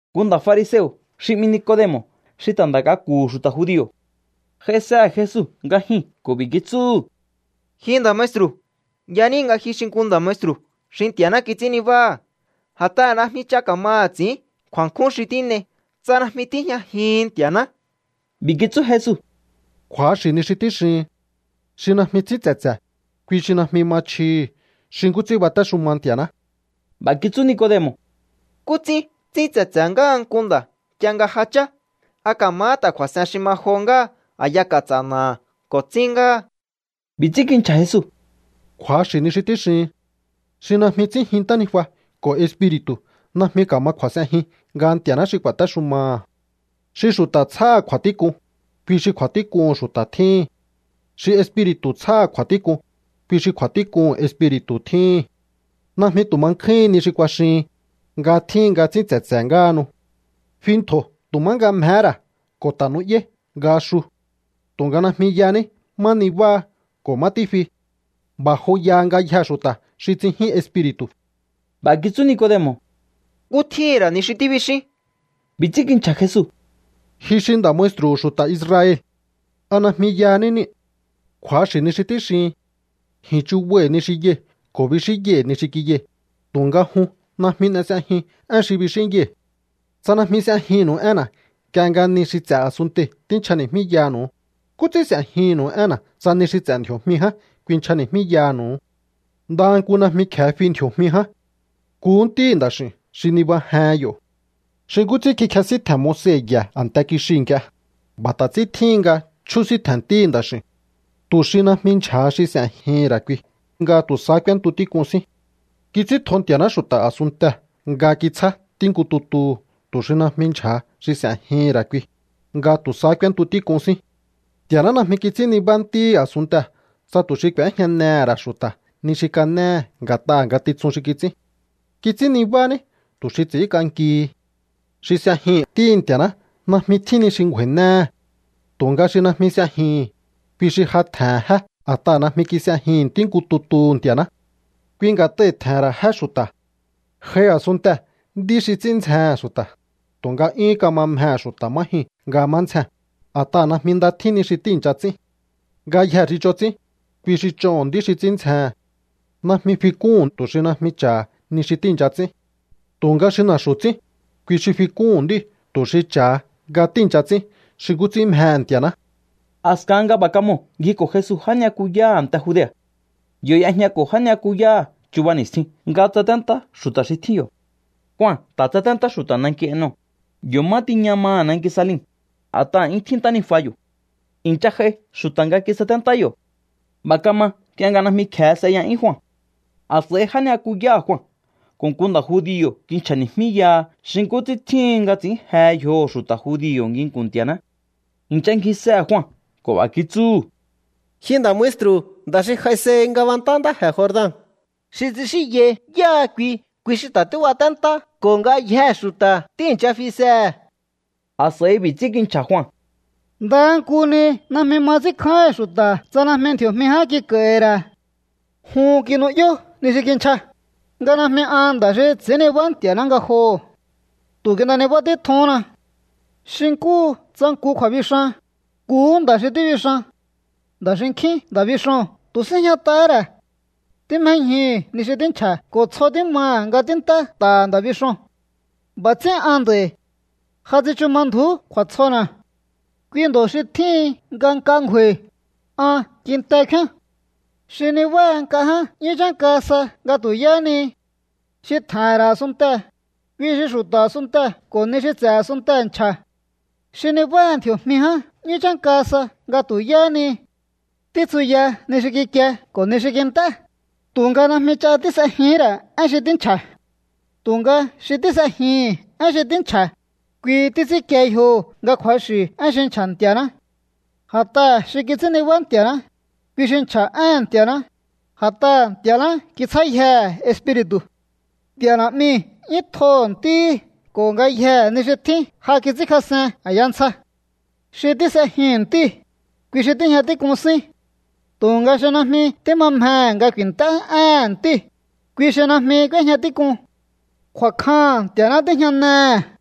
Nku nda̱ fariseo̱ xi 'mi Nicodemo̱ xi ta̱ nda̱ k'aku̱hu̱ xu̱ta̱ judio̱ j'aisehe̱ Jesu nga jyuu̱n ko̱ b'i̱ kitsúhu̱: —Ji nda̱ maestru̱, yaníi̱ nga ji xi nku nda̱ maestru̱ xi Nti̱a̱ná kits'ín nibáha̱. A̱t'aha̱ najmi ch'a ka̱maha̱ ts'i̱ín kju̱a̱nkjún xi tín'ei tsa najmi tíjñajihi̱n Nti̱a̱ná. B'i̱ kitsú Jesu: —Kju̱axi̱ ni xi tíxihin. Xi najmi tsin tse̱tse̱, kui xi najmi ma chjihi̱ xi nkú ts'ín batéxuma Nti̱a̱ná. B'a̱ kitsú Nicodemo̱: —¿Nkú ts'ín tsín tse̱tse̱ ngáha nku nda̱ nk'ie nga ja chá? ¿A ka̱mahá ta̱ kju̱a̱s'en xi ma johó ngáha a̱ya ka̱ts'a̱ na̱aha̱ ko̱ tsín ngáha? B'i̱ ts'ín kinchja̱ Jesu: —Kju̱axi̱ ni xi tíxihin. Xi najmi tsínjin ntánijua ko̱ Espiri̱tu̱ najmi ka̱ma kju̱a̱s'enjin nga Nti̱a̱ná xi ku̱a̱téxumaha̱. Xi xu̱ta̱ tsjáha̱ kju̱a̱tík'un, kui xi kju̱a̱tík'uhu̱n xu̱ta̱ tjíhi̱n. Xi Espiri̱tu̱ tsjáha̱ kju̱a̱tík'un, kui xi kju̱a̱tík'uhu̱n Espiri̱tu̱ tjíhi̱n. Najmi tu̱ ma nkjúhin ni xi kuaxihin, nga tjíhin nga tsín tse̱tse̱ ngáhanu. Fi ntjo̱ tu̱ má nga mjehé ra̱ ko̱ ta̱ nu'yáí nga xu. Tu̱nga najmi yaní má nibáha ko̱ má tífi. B'a̱ joyaha ngayjee̱ xu̱ta̱ xi tsinjín Espiri̱tu̱. B'a̱ kitsú Nicodemo̱: —¿Nkú tjíhi̱n ra̱ ni xi tíbixín? B'i̱ ts'ín kinchja̱ Jesu: —Ji xi nda̱ maestru̱hu̱ xu̱ta̱ Israel. ¿A najmi yaní niu̱? Kju̱axi̱ ni xi tíxihin. Ji̱n chubai̱ ni xi yai̱ ko̱ bixínyai̱ ni xi kiyai̱, tu̱nga jun najmi n'e s'ejiun én xi bixínyai̱. Tsa najmi s'ejinnu̱u énna̱ nk'ie nga ni xi ts'e̱ a̱sunntei̱ tínchjani̱jmíyaha̱nu̱u, ¿nkú ts'ín s'e̱jihi̱nnu̱u énna̱ tsa ni xi ts'e̱ ndji̱o̱jmi ján kuinchjani̱jmíyaha̱nu̱u? Ndaha nku najmi kje̱e fi ndji̱o̱jmi ján. Nkuhú Ntíhi̱ Nda̱x'i̱u̱n xi nibajehen yo̱. ’Xi nkú ts'ín kikjesíntje̱n Moise ye̱ a̱nte kixiu̱ nk'ie, b'a̱ ta̱ ts'ín tjíhin nga chjúsíntje̱n Ntíhi̱ Nda̱x'i̱u̱n, tu̱ xi najmi ndyja̱ha xi s'e̱jihi̱n ra̱ kui nga tu̱ sahá k'úéntu tík'un sín. ’Kits'íntjo Nti̱a̱ná xu̱ta̱ a̱sunntee̱ nga kitsjá Ntí nku tutuhu̱ tu̱ xi najmi ndyja̱ha xi s'e̱jihi̱n ra̱ kui, nga tu̱ sahá k'úéntu tík'un sín. Nti̱a̱ná najmi kits'ín nibá Ntíhi̱ a̱sunntee̱ tsa tu̱ xi k'u̱éjñanehe̱ ra̱ xu̱ta̱ ni xi kanéhe̱ nga̱t'aha̱ ngatitsun xi kits'ín. Kits'ín nibá ní tu̱ xi ts'i̱ínk'ankihi. ’Xi s'ejihi̱n Ntíhi̱ Nti̱a̱ná najmi tjín ni xi ngju̱a̱i̱néhe̱. Tu̱nga xi najmi s'ejihi̱n, kui xi ja tje̱n jé a̱t'aha̱ najmi kis'ejihi̱n Ntí nku tutuhu̱ Nti̱a̱ná. Kui nga̱t'ai̱ tje̱he̱n ra̱ jé xu̱ta̱. J'ai a̱sunntee̱ nd'í xi ts'ín ndzjehe̱n xu̱ta̱, tu̱nga 'yúhún kama mjehe̱ xu̱ta̱ má jyuu̱n nga má ndzjee̱n, a̱t'aha̱ najmi nda tjín ni xi tíi̱ncha ts'ín. Ngayjee̱ xi ch'on ts'ín, kui xi ch'oho̱n nd'í xi ts'ín ndzjehe̱n. Najmi fik'úhu̱n tu̱ xi najmi cha̱ha ni xi tíi̱ncha ts'ín. Tu̱nga xi na̱xu̱ ts'ín, kui xi fik'úhu̱n nd'íu̱ tu̱ xi cha̱ha nga tíi̱ncha ts'ín xi nkú ts'ín mjehe̱ Nti̱a̱ná. A̱skahan nga b'a̱ kamoo̱ ngjiko̱ Jesu já ni'yakuyáha̱ a̱nte Judea̱. Yo̱ y'ejñako̱ já ni'yakuyáha̱ chuba ni̱stjin nga tsaténtá xu̱ta̱ xi tjín yo̱. Jua ta̱ tsaténtá xu̱ta̱ nanki Enon, yo̱ má tiña maha̱ nanki Salim, a̱t'aha̱ 'yún tjín ntánijua yo̱. I̱ncha j'ai xu̱ta̱ nga kisaténtá yo̱. B'a̱ kama nk'ie nga najmi kje̱e s'eya'yún Jua. A̱s'a̱i já ni'yakuyáha̱ Jua ko̱ nku nda̱ judio̱ kinchja̱ni̱jmíyaha xi nkú ts'ín tjíhin nga ts'i̱ín je yjoho̱ xu̱ta̱ judio̱ nginku̱n Nti̱a̱ná. I̱ncha ngjisehe̱ Jua ko̱ b'a̱ kitsúhu̱: —Ji nda̱ maestru̱, nda̱ xi j'aisehi ngabantá ntáje̱ Jordan, xi tsixínyai yáha kui, kui xi ta̱ tíbaténtá ko̱ ngayjee̱ xu̱ta̱ tíi̱ncha fisehe̱. A̱s'a̱i b'i̱ ts'ín kinchja̱ Jua: —Ndaha nku ni najmi ma ts'ínkjáíhi̱n xu̱ta̱ tsa najmi ndji̱o̱jmi ján kik'a̱i̱hi̱ ra̱. Jun kinu'yó ni xi kinchja, nga najmi an nda̱ xi ts'i̱ín nibá Nti̱a̱ná ngajoho̱. Tu̱ kin'e nibá títjuhúnna. Xi nkúhu tsa nku kju̱a̱bixan, nkuhú nda̱ xi tíbixan. Nda̱ xinkjín nda̱ bixoo̱n tu̱ síjñat'ahá ra̱. Tímjéñjuhu̱ ni xi tínchja̱ ko̱ tsjo tímaha̱ nga tínt'é nta̱ha̱ nda̱ bixoo̱n. B'a̱ ts'ín an nd'a̱i̱. Ja tsichu ma ndju̱ú kju̱a̱tsjona̱. Kui ndo̱ xi tjíhin nga nk'a ngju̱a̱i̱, an kinte kfíán. ’Xi nibáha nk'a ján 'yún chánka sa nga tu̱ yáhá ni. Xi tje̱he̱n ra̱ a̱sunntee̱, kui xi xu̱ta̱ a̱sunnte ko̱ ni xi ts'e̱ a̱sunntee̱ nchja̱. Xi nibáha ndji̱o̱jmi ján 'yún chánka sa nga tu̱ yáhá ni. Títsuya ni xi kikie ko̱ ni xi kint'é, tu̱nga najmi ch'a tís'ejihín ra̱ én xi tínchja̱. Tu̱nga xi tís'ejihi̱n én xi tínchja̱, kui títs'ínkie yjoho̱ nga kju̱axi̱ én xi nchja̱ Nti̱a̱ná. A̱t'aha̱ xi kits'ín nibá Nti̱a̱ná, kui xi nchja̱ éhe̱n Nti̱a̱ná, a̱t'aha̱ Nti̱a̱ná kitsjáyjehe̱ Espiri̱tu̱. Nti̱a̱ Na̱'miu̱ 'yún tjoho̱ Ntíhi̱ ko̱ ngayjee̱ ni xi tjín ja kits'ínkjas'en a̱ya ntsja. Xi tís'ejihi̱n Ntíu̱, kui xi tíjña tík'un sín. Tu̱nga xi najmi tíma mjehe̱ nga ku̱i̱nt'é éhe̱n Ntíu̱, kui xi najmi k'úéjña tík'un. Kju̱a̱kjaha̱n Nti̱a̱ná tíjñanehe̱.